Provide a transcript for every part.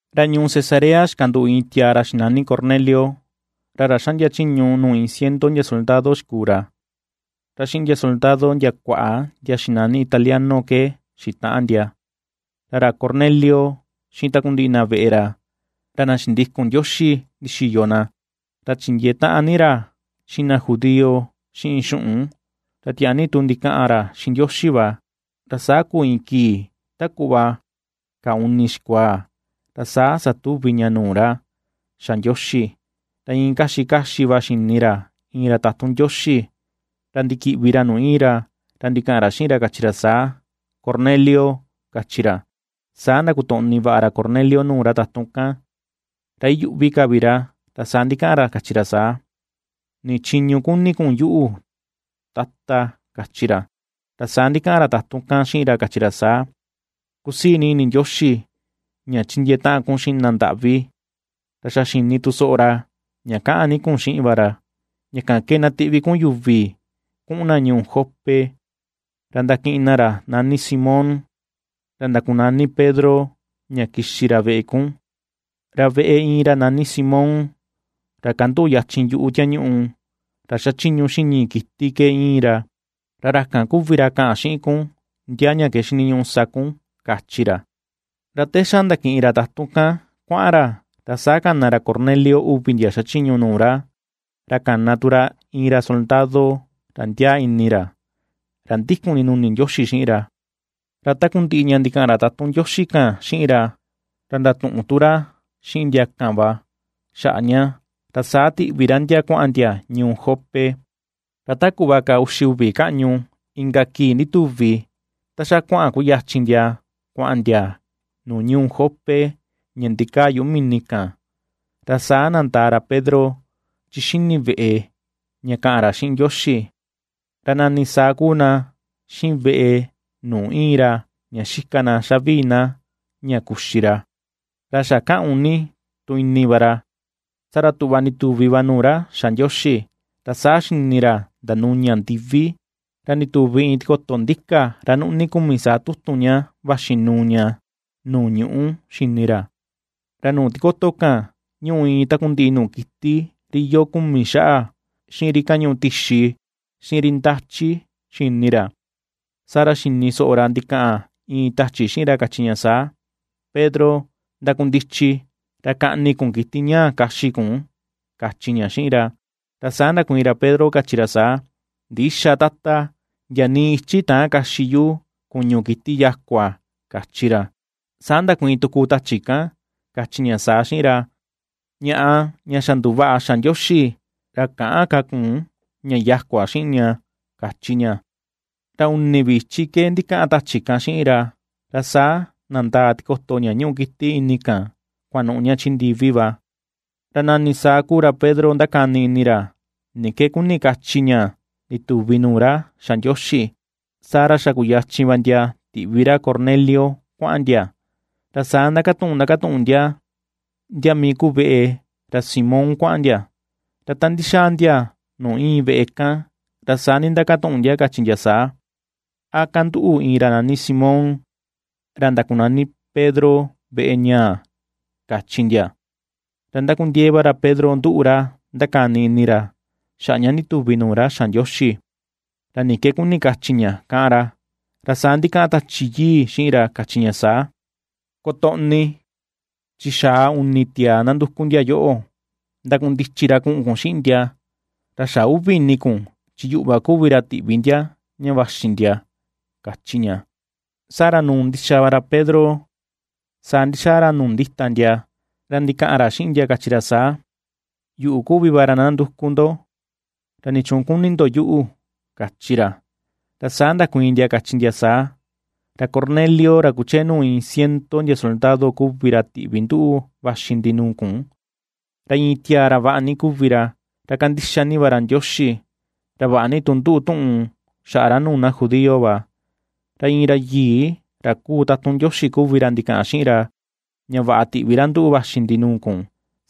Ra ñuu Cesarea xikanduꞌu iin tiaa ra xinani Cornelio, ra ra xaꞌndia chiñu nuu iin ciento ndia soldado xikuu ra. Ra xiꞌin ndia soldado ndia kuaꞌa ndia xinani Italiano ke xitaꞌan ndia. Ra ra Cornelio xiꞌin takundiꞌi na veꞌe ra, ra na xindikun Ndioxi ndixiyo na, ra chindiee taꞌan ni ra xiꞌin na judío xiꞌin xuꞌun, ra tiaa ni tu ndikaꞌan ra xiꞌin Ndioxi va. Ra saa kuu iin kii ta kuꞌva kaa uni xikuaa ra saa satuvi ña nuu ra xa Ndioxi, ra iin kaxi kaxi va xini ra iin ra tatun Ndioxi, ra ndikiꞌvi ra nuu iin ra ra ndikaꞌan ra xiꞌin, kachi ra saa: ―¡Cornelio! ―kachi ra. Saa ndakotoꞌni vaꞌa ra Cornelio nuu ra tatun kan ra iyuꞌvi ka vi ra, ra saa ndikaꞌan ra kachi ra saa: ―¿Ni chiñu kuni kun yuꞌu, Tata? ―kachi ra. Ra saa ndikaꞌan ra tatun kan xiꞌin ra kachi ra saa: ―Kusii ni ini Ndioxi ña chindiee taꞌan kun xiꞌin na ndaꞌvi, ra xa xini tu soꞌo ra ña kaꞌan ni kun xiꞌin va ra. Ña kan ke na tiꞌvi kun yuvi kuꞌun na ñuu Jope ra ndakiꞌin na ra nani Simón, ra ndakunani Pedro, ña na kixi ra veꞌe kun. Ra veꞌe iin ra nani Simón, ra kanduꞌu yachin yuꞌu tiañuꞌu, ra xachiñu xiꞌin ñii kiti ke iin ra, ra ra kan kuvi ra kaꞌan xiꞌin kun ndia ña ke xiniñuꞌu sa kun ―kachi ra. Ra te xa ndakiꞌin ra tatun kan kuaꞌan ra, ra saa kana ra Cornelio uvi ndia xachiñu nuu ra, ra kana tu ra iin ra soldado ra ndiaa ini ra, ra ndikun ndinuni Ndioxi xiꞌin ra. Ra takundiꞌi ña ndikaꞌan ra tatun kan xiꞌin ra, ra ndatuꞌun tu ra xiꞌin ndia kan va xaꞌa ña, ra saa tiꞌvi ra ndia kuaꞌan ndia ñuu Jope. Ra ta kuꞌva ka uxi uvi kaꞌñu inka kii ndituvi ta xa kuaꞌan kuyachin ndia kuaꞌan ndia nuu ñuu Jope ña ndikaa yuꞌu mini kan, Ra saa nandaa ra Pedro chi xini veꞌe ña kaꞌan ra xiꞌin Ndioxi. Ra nani saa kuu na xiꞌin veꞌe nuu iin ra ña xika na xavii na ña kuxi ra, ra xa kaꞌun ni tu ini va ra, saa ra tuꞌva ndituvi va nuu ra xa Ndioxi, ra saa xini ra ndanuña ndivi, ra ndituvi iin tikoto ndika ra nuꞌni kumi saa tutun vaxi nuu ña nuu ñuꞌu xini ra. Ra nuu tikoto kan ñúꞌu iin takundiꞌi nuu kiti ri iyoo kumi xaꞌa, xiꞌin ri kañuꞌu tixi, xiꞌin ri ndachi, xini ra. Saa ra xini soꞌo ra ndikaꞌan iin tachi xiꞌin ra kachi ña saa: ―Pedro, ndakundichi ra kaꞌni kun kiti ñaa kaxi kun ―kachi ña xiꞌin ra. Ra saa ndakuiin ra Pedro, kachi ra saa: ―Ndïxa, Tata; ndia nii ichi täan kaxi yu kuñu kiti yakua ―kachi ra. Saa ndakuiin tuku tachi kan, kachi ña saa xiꞌin ra: ―Ñaꞌa ña xa nduvaꞌa xa Ndioxi, ra käꞌan ka kun ña yakua xiꞌin ña ―kachi ña. Ra uni vi ichi ke ndikaꞌan tachi kan xiꞌin ra, ra saa nandaa tikoto ña ñuꞌu kiti ini kan kuanuꞌu ña chi ndivi va. Ra nani saa kuu ra Pedro ndakani ini ra ni ke kuni kachi ña ndituvi nuu ra xa Ndioxi, saa ra xa kuyachin va ndia tiꞌvi ra Cornelio kuaꞌan ndia, ra saa ndakatuꞌun ndakatuꞌun ndia ndia mii kuu veꞌe ra Simón kuaꞌan ndia. Ra ta ndixaa ndia nuu iin veꞌe kan, ra saa ndindakatuꞌun ndia, kachi ndia saa: ―¿A kanduꞌu iin ra nani Simón, ra ndakunani Pedro veꞌe ñaa? ―kachi ndia. Ra ndakundiee va ra Pedro nduꞌu ra ndakani ni ini ra xaꞌa ña ndituvi nuu ra xa Ndioxi, ra ni ke kuni kachi ña káꞌan ra. Ra saa ndikaꞌan Tachi Yii xiꞌin ra kachi ña saa: ―Kotoꞌni; chi xaa uni tiaa nanduku ndia yoꞌo. Ndakundichi ra kuꞌun kun xiꞌin ndia, ra xä uvi ini kun chi yuꞌu va kuvi ra tiꞌvi ndia ña vaxi ndia ―kachi ña. Saa ra nuu ndixa va ra Pedro nuu ra saa ndixaa ra nuu ndita ndia, ra ndikaꞌan ra xiꞌin ndia kachi ra saa: ―Yuꞌu kuvi va ra nanduku ndo, ¿ra nichuun kuni ndo yuꞌu? ―kachi ra. Ra saa ndakuiin ndia, kachi ndia saa: ―Ra Cornelio ra kuchee nuu iin ciento ndia soldado kuvi ra tiꞌvi nduꞌu vaxi ndi nuu kun, ra iin tiaa ra vaꞌa ni kuvi ra, ra kandixa ni va ra Ndioxi, ra vaꞌa ni tu nduꞌu tuꞌun xaꞌa ra nuu na judío va. Ra iin ra yii ra kuu tatun Ndioxi kuvi ra ndikaꞌan xiꞌin ra ña vaꞌa tiꞌvi ra nduꞌu vaxi ndi nuu kun,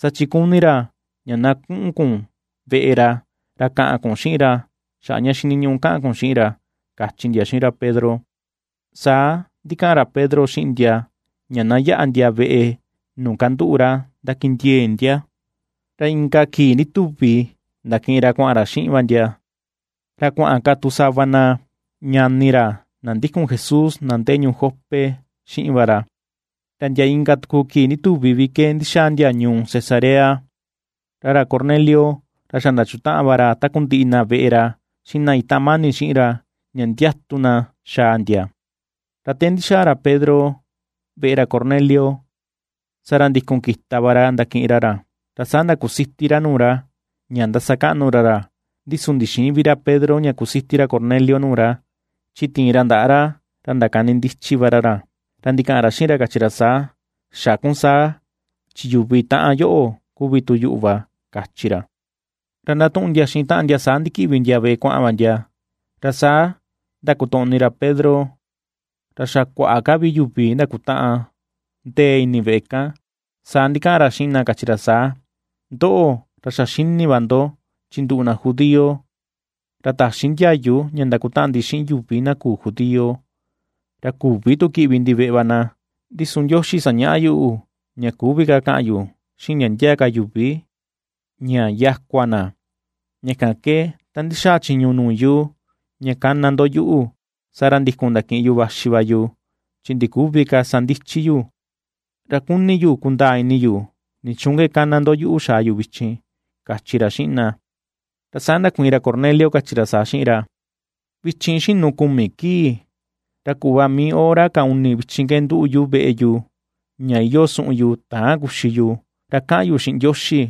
saa chi kuni ra ña na kuꞌun kun veꞌe ra, ra kaꞌan kun xiꞌin ra xaꞌa ña xiniñuꞌu kaꞌan kun xiꞌin ra ―kachi ndia xiꞌin ra Pedro. Saa ndikaꞌan ra Pedro xiꞌin ndia ña na yaꞌa ndia veꞌe nuu kanduꞌu ra ndakindiee ndia. Ra ikan kii ndituvi ndakiꞌin ra kuaꞌan ra xiꞌin va ndia, ra kuaꞌan ka tu sava na ñani ra na ndikun Jesús na ndee ñuu Jope xiꞌin va ra. Ra ndia inka tuku kii ndituvi vi ke ndixaa ndia ñuu Cesarea. Ra ra Cornelio ra xa ndachutaꞌan va ra takundiꞌi na veꞌe ra xiꞌin na itaꞌan mani xiꞌin ra, ña ndiatu na xaa ndia. Ra te ndixaa ra Pedro veꞌe ra Cornelio, saa ra ndikun kita va ra ndakiꞌin ra ra, ra saa ndakusiti ra nuu ra, ña ndasakaꞌnu ra ra. Ndi su ndixïin vi ra Pedro ña kusiti ra Cornelio nuu ra, chi tiin ra ndaꞌa ra ra ndakanindichi va ra ra, ra ndikaꞌan ra xiꞌin ra kachi ra saa: ―Xä kun saa chi yuvi taꞌan yoꞌo kuvi tu yuꞌu va ―kachi ra. Ra ndatuꞌun ndia xiꞌin taꞌan ndia saa ndikiꞌvi ndia veꞌe kuaꞌan va ndia, ra saa ndakotoꞌni ra Pedro ra xa kuaꞌa ka vi yuvi ndakutaꞌan ndee ini veꞌe kan. Saa ndikaꞌan ra xiꞌin na kachi ra saa: ―Ndoꞌo ra xa xini va ndo chi nduꞌu na judío, ra täxi ndiayu ña ndakutaꞌan ndi xiꞌin yuvi na küu judío, ra küvi tu kiꞌvi ndi veꞌe va na. Ndi su Ndioxi sañaꞌa yuꞌu ña küvi ka kaꞌan yu xiꞌin ndia ndia ka yuvi ña yakua na. Ña kan ke ta ndixaa chiñu nuu yu ña kana ndo yuꞌu, saa ra ndikun ndakiꞌin yu vaxi va yu, chi ndiküvi ka sa ndichi yu. Ra kuni yu kundaa ini yu, nichuun ke kana ndo yuꞌu xaa yu vichin ―kachi ra xiꞌin na. Ra saa ndakuiin ra Cornelio, kachi ra saa xiꞌin ra: ―Vichin xinu kumi kii, ra kuꞌva mii hora ka uni vichin ke nduꞌu yu veꞌe yu ña iyoo suꞌun yu täan kuxi yu, ra kaꞌan yu xiꞌin Ndioxi,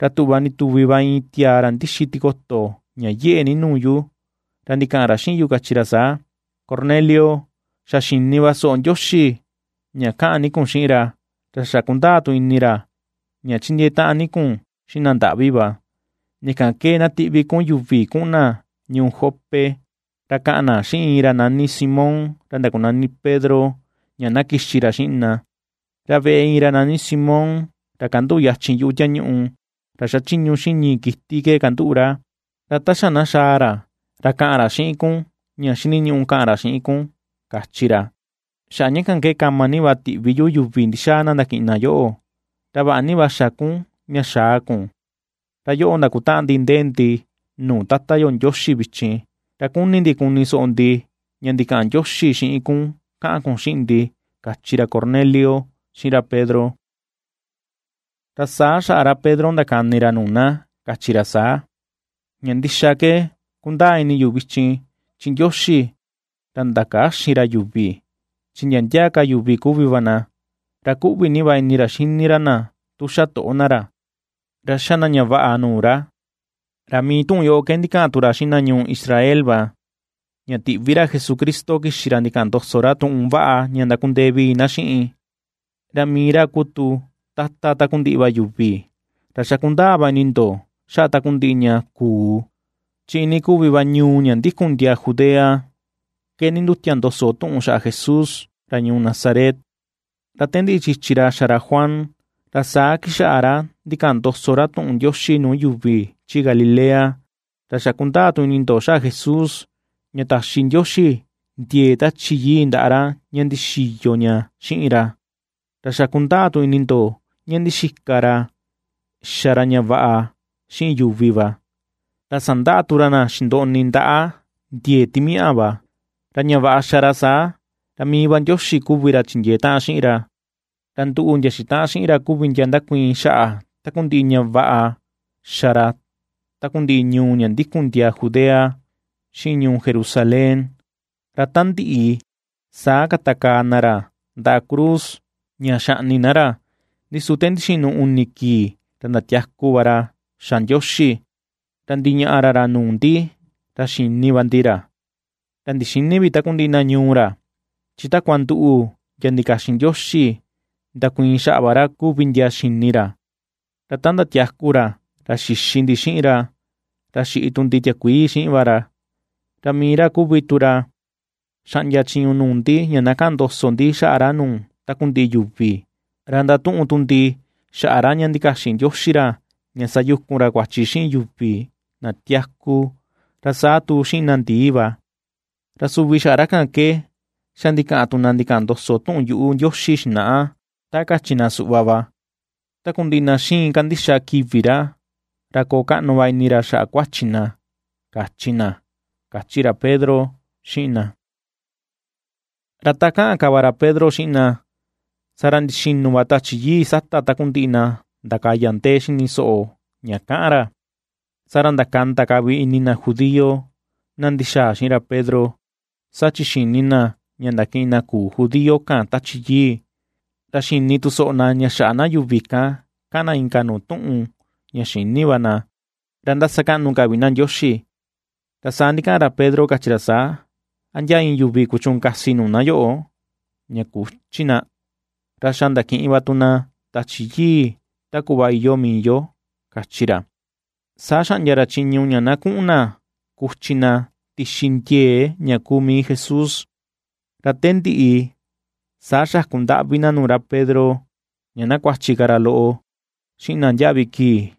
ra tuꞌva ndituvi va iin tiaa ra ndixi tikoto ña yeꞌe ni nuu yu. Ra ndikaꞌan ra xiꞌin yu kachi ra saa: “Cornelio, xa xini va soꞌo Ndioxi ña kaꞌan ni kun xiꞌin ra, ra xa kundaa tu ini ra ña chindiee taꞌan ni kun xiꞌin na ndaꞌvi va. Ña kan ke na tiꞌvi kun yuvi kuꞌun na ñuu Jope, ra kaꞌan na xiꞌin ra nani Simón ra ndakunani Pedro ña na kixi ra xiꞌin na. Ra veꞌe iin ra nani Simón ra kanduꞌu yachin yuꞌu tiañuꞌu ra xachiñu xiꞌin ñii kiti ke kanduꞌu ra. Ra ta xa na xaa ra, ra kaꞌan xiꞌin kun ña xiniñuꞌu kaꞌan ra xiꞌin kun.” kachi ra. Xaꞌa ña kan ke kama ni va tiꞌvi yuvi ndixaa na ndakiꞌin na yoꞌo, ra vaꞌa ni va xa kun ña xaa kun. Ra xa yoꞌo ndakutaꞌan ndi ndee ndi nuu Tata yo Ndioxi vichin, ra kuni ndi kuni soꞌo ndi ña ndikaꞌan Ndioxi xiꞌin kun kaꞌan kun xiꞌin ndi ―kachi ra Cornelio xiꞌin ra Pedro. Ra saa xaꞌa ra Pedro ndakani ra nuu na kachi ra saa: ―Ña ndixa ke kundaa ini yu vichin chi Ndioxi ra ndakäxin ra yuvi. Chi ndia ndia ka yuvi kuvi va na, ra kuꞌvi ni va ini ra xini ra na tu xa toꞌo na ra, ra xa na ña vaꞌa nuu ra. Ra mii tuꞌun yoꞌo ke ndikaꞌan tu ra xiꞌin na ñuu Israel va, ña tiꞌvi ra Jesucristo kixi ra ndikaꞌan ndoso ra tuꞌun vaꞌa ña ndakundee vii na xiꞌin, ra mii ra kuu tu Tata takundiꞌi va yuvi. Ra xa kundaa va ini ndo xaꞌa takundiꞌi ña kuu, chi iinii kuvi va ñuu ña ndikun ndiaa Judea ke nindutia ndoso tuꞌun xaꞌa Jesús ra ñuu Nazaret, ra te ndiꞌi chichi xa ra Juan, ra saa kixaꞌa ra ndikaꞌan ndoso ra tuꞌun Ndioxi nuu yuvi chi Galilea. Ra xa kundaa tu ini ndo xaꞌa Jesús, ña taxi Ndioxi ndiee Tachi Yii ndaꞌa ra ña ndixiyo ña xiꞌin ra, ra xa kundaa tu ini ndo ña ndixika ra xa ra ña vaꞌa xiꞌin yuvi va, ra sandaꞌa tu ra na xindoꞌni ndaꞌa ndiee timiaꞌa va. Ra ña vaꞌa xa ra saa, ra mii va Ndioxi kuvi ra chindiee taꞌan xiꞌin ra. Ra nduꞌu ndia xitaꞌan xiꞌin ra kuvi ndia ndakuiin xaꞌa takundiꞌi ña vaꞌa xa ra takundiꞌi ñuu ña ndikun ndiaa Judea xiꞌin ñuu Jerusalén. Ra ta ndiꞌi saa katakaa na ra ndaꞌa cruz ña xaꞌni na ra. Ndi su te ndixinu uni kii ra ndatiaku va ra xa Ndioxi, ra ndiñaꞌa ra ra nuu ndi ra xini va ndi ra. Ra ndixïni vi takundiꞌi na ñuu ra, chi takua nduꞌu ndia ndikaxin Ndioxi ndakuiin xaꞌa va ra kuvi ndia xini ra. Ra ta ndatiaku ra ra xixi ndi xiꞌin ra, ra xiꞌi tu ndi tiakuii xiꞌin va ra. Ra mii ra kuvi tu ra xaꞌndia chiñu nuu ndi ña na kaꞌan ndoso ndi xaꞌa ra nuu takundiꞌi yuvi, ra ndatuꞌun tu ndi xaꞌa ra ña ndikaxin Ndioxi ra ña sayukun ra kuachi xiꞌin yuvi na tiaku, ra saa tu xiꞌin na ndii va. Ra suvi xaꞌa ra kan ke xa ndikaꞌan tu na ndikaꞌan ndoso tuꞌun yuꞌu Ndioxi xinaꞌa ta kachi na suꞌva va, takundiꞌi na xiin kandixa kivi ra, ra koo kaꞌnu va ini ra xaꞌa kuachi na, kachi na ―kachi ra Pedro xiꞌin na. Ra ta kaꞌan ka va ra Pedro xiꞌin na, saa ra ndixinu va Tachi Yii sata takundiꞌi na ndakaya ndee xini soꞌo ña kaꞌan ra. Saa ra ndakanda ka vi ini na judío, na ndixaa xiꞌin Pedro, saa chi xini na ña ndakiꞌin na küu judío kan Tachi Yii. Ra ^xini tu soꞌo na ña xaꞌa na yuvi kan kaꞌan na inka nuu tuꞌun ña xïni va na, ra ^ndasakaꞌnu ka vi na Ndioxi. Ra saa ndikaꞌan ra Pedro kachi ra saa: ―¿A ndia iin yuvi kuchuun kasi nuu na yoꞌo ña küchi na, ra xa ndakiꞌin va tu na Tachi Yii ta kuꞌva iyoo mii yo? ―kachi ra. Saa xaꞌndia ra chiñu ña na kuꞌun na kuchi na tixi ndiee ña kuu mii Jesús. Ra te ndiꞌi saa xaku ndaꞌvi na nuu ra Pedro ña na kuachi ka ra loꞌo xiꞌin na ndiaꞌvi kii.